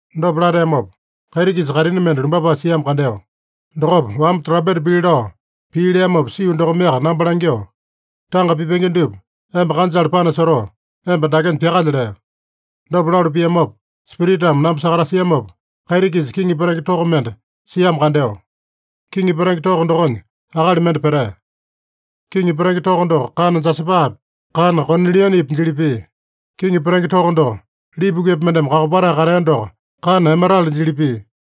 Dopa lateamopa, kaiti-kisa kaitini mende lumbapae siamo kandeo. Dokopa, wamba trampeta pili lao pii leamopa sio dokomeaka namba langyoo, “Tanga pipenge dupa emba kanjale panasotoo, emba dakenya pyakalya” lea. Dopa lalu piamopa Spiritame namba sakatasiamopa, kaiti-kisa kiŋi petenge toko mende siamo kandeo. (Kiŋi petenge toko dokonya akali mende petea.) Kiŋi petenge toko doko kana jasapapi, kana konilianepi jili pia. Kiŋi petenge toko doko lipukepa mendeme kakopatae katea doko kana emerale jili pia.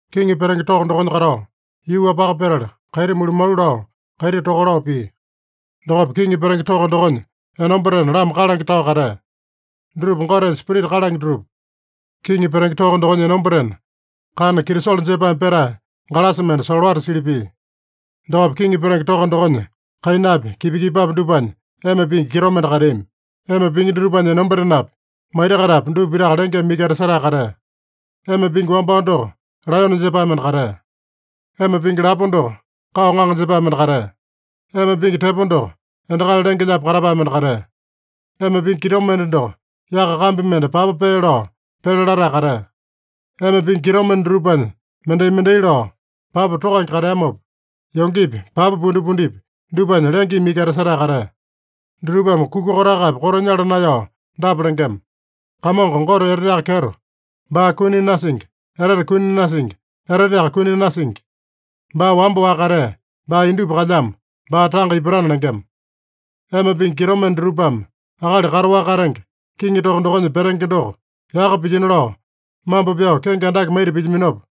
Kiŋi petenge toko dokonya katao, yuu-wapaka petala, kaiti mulumalu lao, kaiti toka lao pia. Dokopa kiŋi petenge toko dokonya enombatena lama kalange tao katea. Dutupa Gotenya spirita kalange dutupa. Kiŋi petenge toko dokonya enombatena kana kitisolo jepaeme petae galasa mende solowata sili pia. Dokopa kiŋi petenge toko dokonya kainapi, kipa-kipapi dupanya ema pingi kitomende kateami. Ema pingi dutupanya enombatenapi, maita-kaitapi dupa pitaka lengeme iki etasetae katea. Ema pingi wambao doko laeyone jepae mende katea. Ema pingi lapo doko kao ŋaŋa jepae mende katea. Ema pingi tepo doko endakali lenge-lyaapi katapae mende katea. Ema pingi kitomende doko yaka kambi mende papa pee lao pele latae katea. Ema pingi kitomende dutupanya mendai-mendai lao papa tokange kateamopa, yongepi, papa pundipundipi, dupanya lengeme iki etasetae katea. Dutupame kuka kotakapi koto nyala naeyao dapa lengema: “Kamongo Gote Eteteaka Kyeto, baa kuni nasingi, etete kuni nasingi, eteteaka kuni nasingi. Baa wamba-waka katea, baa indupa kalyamo, baa tanga ipatana” lengema. Ema pingi kitomende dutupame akali kataowaka katenge, kiŋi toko dokonya petenge doko yaka pilyino lao mambo pyao kenge andake maita pilyaminopa,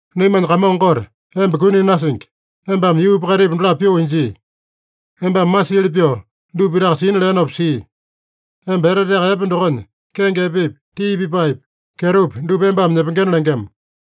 “Naimanya Kamongo Gote, emba kuni nasingi. Embame yuupa kaitipa dolapo pyoo injii. Embame masiili pyoo dupa pitaka sina leenopa sia. Emba eteteaka epe dokonya, kenge epepi, tii pipaepi, kyetopi dupa embame nyepengena” lengema.